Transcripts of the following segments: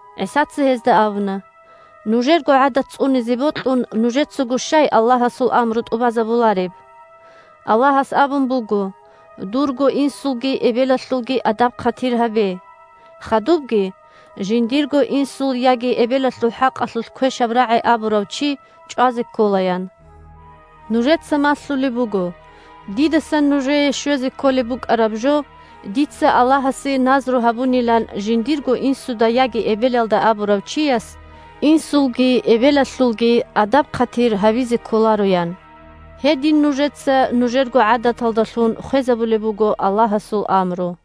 ГӀисаца гьезда абуна: – Нужерго гӀадат цӀунизе бокьун, нужецаго щай Аллагьасул амру тӀубазабулареб? Аллагьас абун буго: «Дурго инсулги эбелалъулги адаб-хъатир гьабе!» Хадубги: «Жиндирго инсул яги эбелалъул хӀакъалъулъ квешаб рагӀи абурав чи чӀвазе ккола», – ян. Нужеца малъулеб буго: «Дидасан нужее щвезе кколеб букӀараб жо дица Аллагьасе назру гьабунилан жиндирго инсуда яги эбелалда абурав чияс инсулги эбелалъулги адаб-хъатир гьабизе кколаро», – ян. Гьедин нужеца нужерго гӀадаталдалъун хвезабулеб буго Аллагьасул амру.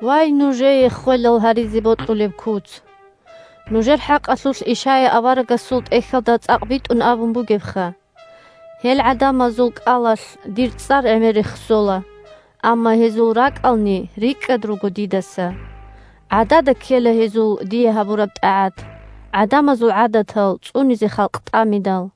Вай, нужее ххвелал гьаризе бокьулеб куц! Нужер хӀакъалъулъ Ишая аварагасул тӀехьалда цӀакъ битӀун абун бугебха: «Гьел гӀадамазул кӀалалъ Дир цӀар гӀемер рехсола, Амма гьезул ракӀални рикӀкӀад руго Дидаса. ГӀадада ккела гьезул Дие гьабураб тӀагӀат, ГӀадамазул гӀадатал цӀунизе халкъ тӀамидал».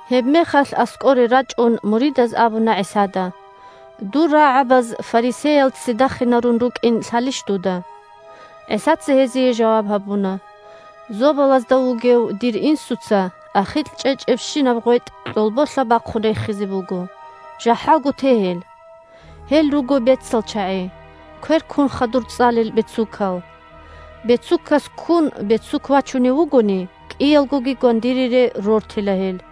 Гьебмехалъ, аскӀоре рачӀун, муридаз абуна ГӀисада: – Дур рагӀабаз фарисеял ццидахинарун рукӀин лъалищ дуда? ГӀисаца гьезие жаваб гьабуна: – Зобалазда вугев дир Инсуца ахикь чӀечӀебщинаб гъветӀ кьолболъа бахъун рехизе буго. ЖахӀалго те гьел. Гьел руго бецал чагӀи, квер ккун хадур цӀалел бецукал. Бецукас ккун бецук вачунев вугони, кӀиялгоги гвандинире рортила гьел.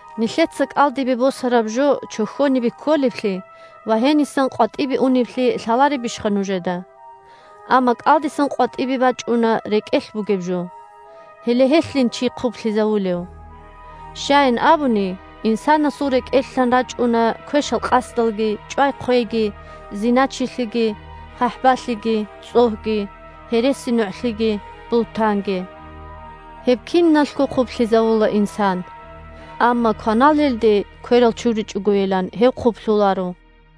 Нилъеца кӀалдибе босараб жо чохьонибе кколеблъи ва гьенисан къватӀибе унеблъи лъаларебищха нужеда? Амма кӀалдисан къватӀибе бачӀуна рекӀелъ бугеб жо. Гьеле гьелъин чи хъублъизавулев. Щаян абуни, инсанасул рекӀелъан рачӀуна квешал къасдалги, чӀвай-хъвейги, зиначилъиги, хъахӀбалъиги, цӀогьги, гьересинугӀлъиги, бугьтанги. Гьеб киналъго хъублъизавула инсан. Амма кваналелде кверал чуричӀогойилан гьев хъублъуларо.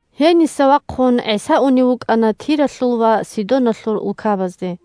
Гьениса вахъун ГӀиса унев вукӀана Тиралъул ва Сидоналъул улкабазде.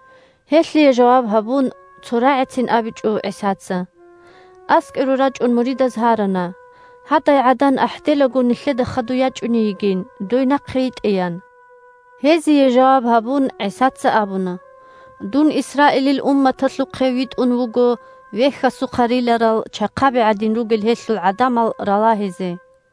Гьелъие жаваб гьабун цо рагӀицин абичӀо ГӀисаца. АскӀоре рачӀун муридаз гьарана, гьадай гӀадан ахӀделаго нилъеда хадуй ячӀуней йигин, дой нахъе йитӀеян. Гьезие жаваб гьабун ГӀисаца абуна: – Дун Исраилил умматалъухъе витӀун вуго вехьасухъа риларал чахъаби гӀадин ругел гьелъул гӀадамал ралагьизе.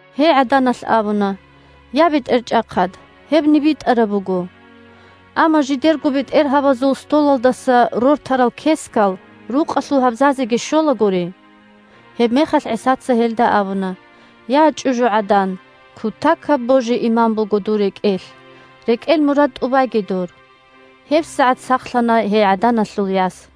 Гьей гӀаданалъ абуна: – Я, БетӀерчӀахъад! Гьебни битӀараб буго. Амма жидерго бетӀергьабазул столалдаса рортарал кескал рукъалъул гьабзазеги щолагури. Гьебмехалъ ГӀисаца гьелда абуна: – Я, чӀужугӀадан! Кутакаб божи-иман буго дур рекӀелъ. РекӀел мурад тӀубайги дур! ГьебсагӀат сахлъана гьей гӀаданалъул яс.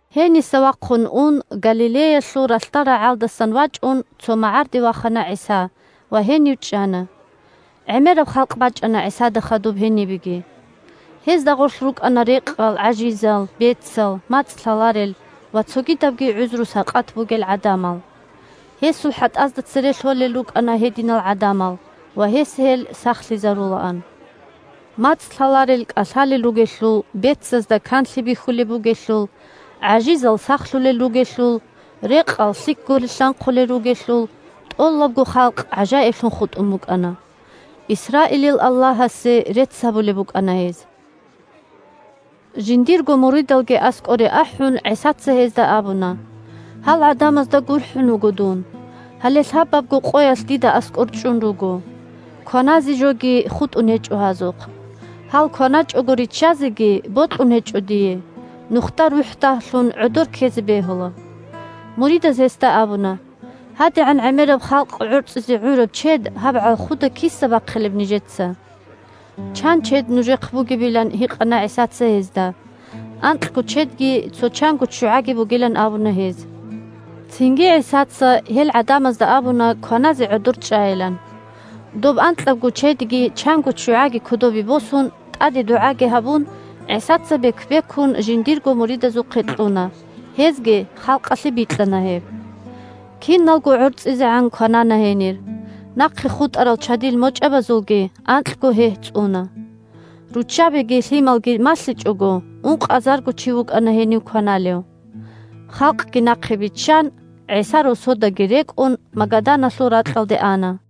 Гьениса вахъун ун, Галилеялъул ралъдал рагӀалдасан вачӀун, цо магӀарде вахана ГӀиса ва гьенив чӀана. ГӀемераб халкъ бачӀана ГӀисада хадуб гьенибеги. Гьезда гъорлъ рукӀана рекъал, гӀажизал, бецал, мацӀ лъаларел ва цогидабги гӀузру-сакъат бугел гӀадамал. Гьесул хӀатӀазда цере лъолел рукӀана гьединал гӀадамал, ва гьес гьел сахлъизарулаан. МацӀ лъаларел кӀалъалел ругелъул, бецазда канлъи бихьулеб бугелъул, гӀажизал сахлъулел ругелъул, рекъал лъикӀго рилълъанхъулел ругелъул, тӀолабго халкъ гӀажаиблъун хутӀун букӀана. Исраилил Аллагьасе рецц гьабулеб букӀана гьез. Жиндирго муридалги аскӀоре ахӀун, ГӀисаца гьезда абуна: – Гьал гӀадамазда гурхӀун вуго дун. Гьале лъабабго къоялъ дида аскӀор чӀун руго. Кваназе жоги хутӀун гьечӀо гьазухъ. Гьал кваначӀого риччазеги бокьун гьечӀо дие: нухда рухӀ дагьлъун гӀодор ккезе бегьула. Муридаз гьесда абуна: – ГьадигӀан гӀемераб халкъ гӀорцӀизе гӀураб чед гьаб гӀалхуда киса бахъилеб нижеца? Чан чед нужехъ бугебилан гьикъана ГӀисаца гьезда. Анкьго чедги цо чанго ччугӀаги бугилан абуна гьез. Цинги ГӀисаца гьел гӀадамазда абуна кваназе гӀодор чӀайилан. Доб анкьабго чедги чанго ччугӀаги кодобе босун, тӀаде дугӀаги гьабун, ГӀисаца бек-бекун жиндирго муридазухъе кьуна, гьезги халкъалъе бикьана гьеб. Киналго гӀорцӀизегӀан кванана гьенир, нахъе хутӀарал чадил мочӀабазулги анкьго гьегь цӀуна. Руччабиги лъималги малъичӀого, ункъазарго чи вукӀана гьенив кваналев. Халкъги нахъе биччан ГӀиса, росодаги рекӀун, Магаданалъул ракьалде ана.